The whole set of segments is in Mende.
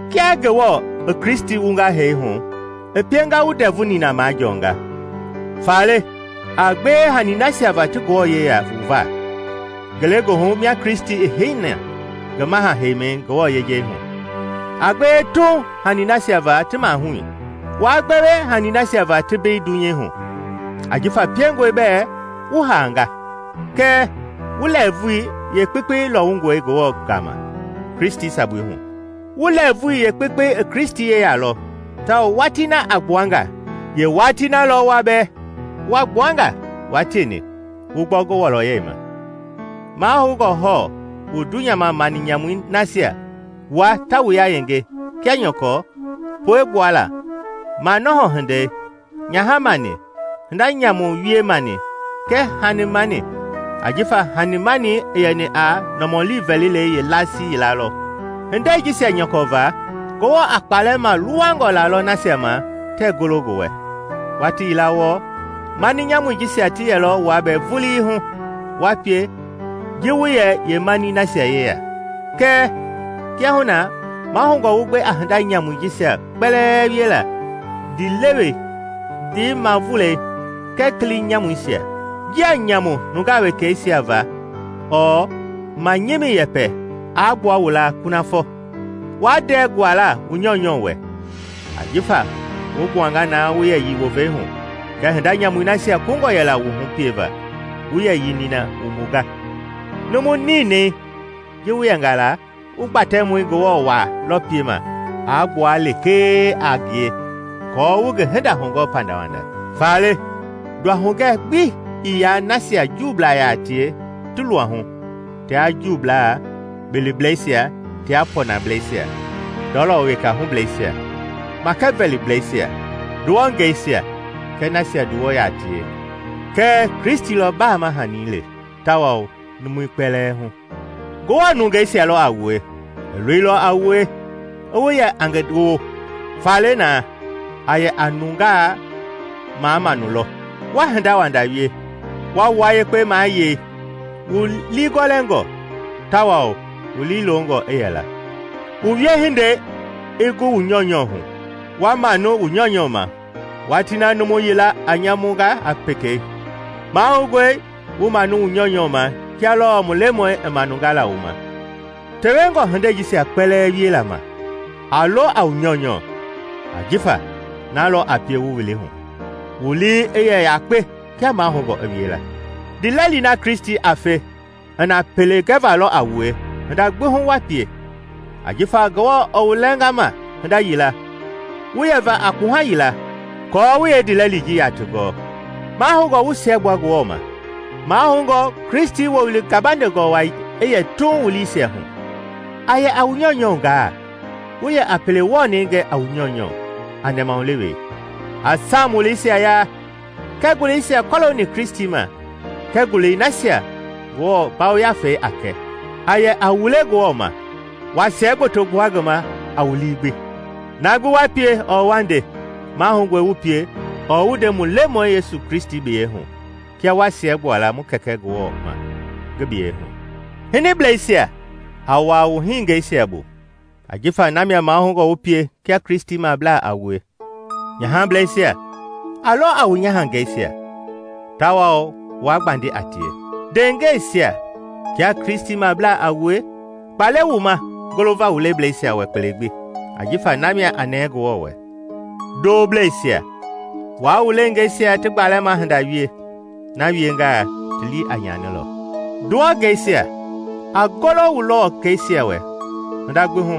Kia Ngewɔ i Kristi wunga hee hu i pienga wu ndɛvu nina majɔɔnga, faale a gbewe hanii nasia va ti Ngewɔ yeya wu va ngelegoohu mia Kristi i heini na ngi maha-heimɛi Ngewɔ yejei hu. A gbewe tuuŋ hanii nasia va ti mahui, waa gbewe hanii nasia va ti mbei dunyei hu. Ajifa piengɔe bɛɛ wu haanga, kɛɛ wu lɛɛvui yeekpekpei lɔwungɔe Ngewɔ gama, Kristi sabui hu. Wu lɛɛvui yeekpekpei i Kristi yeya lɔ, tawao watii na a gbua nga, yeewatii na lɔ wua bɛɛ wa gbua nga wua tieni wu gbɔ ngi wɔlɔyɛi ma. Mahoungɔ hɔɔ wu dunyama mani nyamui nasia waa ta wu yayenge kia nyɔkɔ: puegbuala, manɔhɔ hindei, nyaha mani, hinda nyamu wie mani kɛɛ hani-mani (ajifa hani-mani i yɛni a nɔmɔli vɛlilei yeelasii yila lɔ.) Hindei jisia nyɔkɔ va, Ngewɔ a kpaalɛ maluwangɔ lalɔ nasia ma tɛɛ golo ngi wɛ. Watii yila wɔɔ, mani nyamui jisia ti yɛlɔ wua bɛɛ vulii hu, wa pie ji wu yɛ yeemanii nasia yeya. Kɛɛ kiahuna na mahoungɔ wu gbe a hinda nyamui jisia kpɛlɛɛ wiela: ndiilewei, ndiimavulɛi, kɛɛ kili nyamuisia. Njia nyamu nungaa wekeisia va ɔɔ manyimi yɛpɛ aa gbua wu laa kunafɔ. Waa ndɛɛ guala wu nyɔunyɔ wɛ, ajifa wu gbuanga na wu yɛyii wovei hu kɛɛ hinda nyamui nasia kungɔ yɛla wu hu pieva, wu yɛyii nina wumbunga. Numu ninɛi ji wu yɛnga la, wu Gbatɛmɔi Ngewɔ waa lɔ piema a gbua lekee a ngie aako wu ngi hinda hugɔɔ pandawanda. Faale, nduahugɛ gbi ii yaa nasia Juublaa yaa tie ti luahu tia Juublaa, biliblɛisia tia pɔnɔblɛisia, ndɔlɔ weka hublɛisia, makɛvɛliblɛisia, nduwɔngɛisia kɛɛ nasia nduwɔ yaa tie, kɛɛ Kristi lɔ baama hanii le tawao numui kpɛlɛɛ hu. Ngewɔ nungeisia lɔ a wue; i loilɔ a wue i wu yɛ a ngi woo. Faale na, a yɛ a nungaa mamaanu lɔ, wa hinda wanda wie, wa wua yekpe mayei, wu liigɔlɛngɔ, tawao wu liilongɔ i yɛla. Wu wiehindei i gu wu nyɔunyɔ hu, wa manu wu nyɔunyɔ ma watii na numu yila a nyamu ga a pekei. Mahoungɔe wu manu wu nyɔunyɔ ma kia lɔɔ mu Lemɔi i manunga la wu ma. Tewengɔ hindei jisia kpɛlɛɛ wiela ma, a lo a wu nyɔunyɔ ajifa na lɔ a pie wu wili hu, wu lii i yɛ yakpe kia mahoungɔ i wiela. Ndiilɛli na Kristi a fe i na pele gɛva lɔ a wue hinda gbi hu wa pie; ajifa Ngewɔ i wu lɛnga ma hinda yila wu yɛva a kpuha yila aako wu yeendiilɛli ji yaati gɔɔ. Mahoungɔ wu siɛgbua Ngewɔ ma. Mahoungɔe Kristi Wowili gabandengɔ wai i yɛ tuuŋ wu liisia hu. A yɛ a wu nyɔunyɔ gaa, wu yɛ a pele wɔnɛi gɛ a wu nyɔunyɔ a nɛmahulewei. A Saam wuleisia yaa, kɛɛ nguleisia kɔlooni Kristi ma kɛɛ ngulei nasia Ngewɔ Yafei a kɛ; a yɛ a wule Ngewɔ ma, wa siɛgboto gbua ngi ma a wu lii gbi. Na gbi wa pie ɔɔ wa nde, mahoungɔ wu pie ɔɔ wu nde mu Lemɔi Yesu biyɛi hu kia wa siɛgbua la mu Kɛkɛ Ngewɔ ma ngi biyɛi hu. Hiniblɛisia, a wuaa wu hiningɛisia bu, ajifa na mia mahoungɔ wu pie kia Kristimablaa a wue. Nyahableisia, a lo a wu nyahangeisia, tawao waa gbandi a tie. Ndeengɛisia, kia Kristimablaa a wue, kpa le wu ma golova wu leblɛisia wɛ kpele gbi, ajifa na mia a nɛɛ Ngewɔ wɛ. Ndooblɛisia, waa wu leengeisia ti gbalɛma hinda wie; na wiengaa ti lii a nyanilɔ. Nduwɔngɛisia, a golo wu luwɔkɛisia wɛ hinda gbi hu,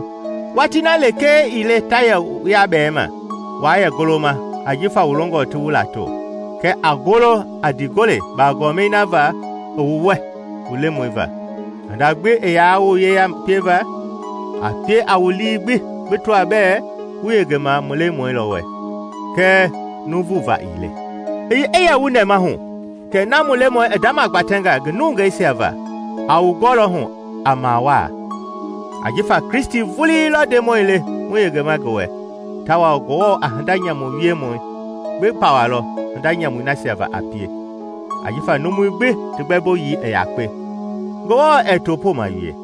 watii na lekee ii le ta yɛ wu yabɛɛma waa yɛ goloma jifa wu longɔ ti wu lato; kɛɛ a golo a ndiigole bagɔɔmɛi na va i wu wɛ mu Lemɔi va. Hinda gbi i yaa wu yeya pieva, a pie a wu lii gbi bi tɔa bɛɛ wu yengema mu Lemɔi lɔ wɛ, kɛɛ nuuvu va ii le. I ye wu nɛmahu kɛ na mu Lemɔi i ndamagbatɛnga ngi nungeisia va a wu gɔlɔ hu a mawaa. Ajifa Kristi vulii lɔ Ndemɔi le wu yengema ngi wɛ. Tawao Ngewɔ a hinda nyamu wiemɔ gbi pawalɔ hinda nyamui nasia va a pie, ajifa numui gbi ti gbɛmboyii i yakpe, Ngewɔ ɛɛ topooma wie.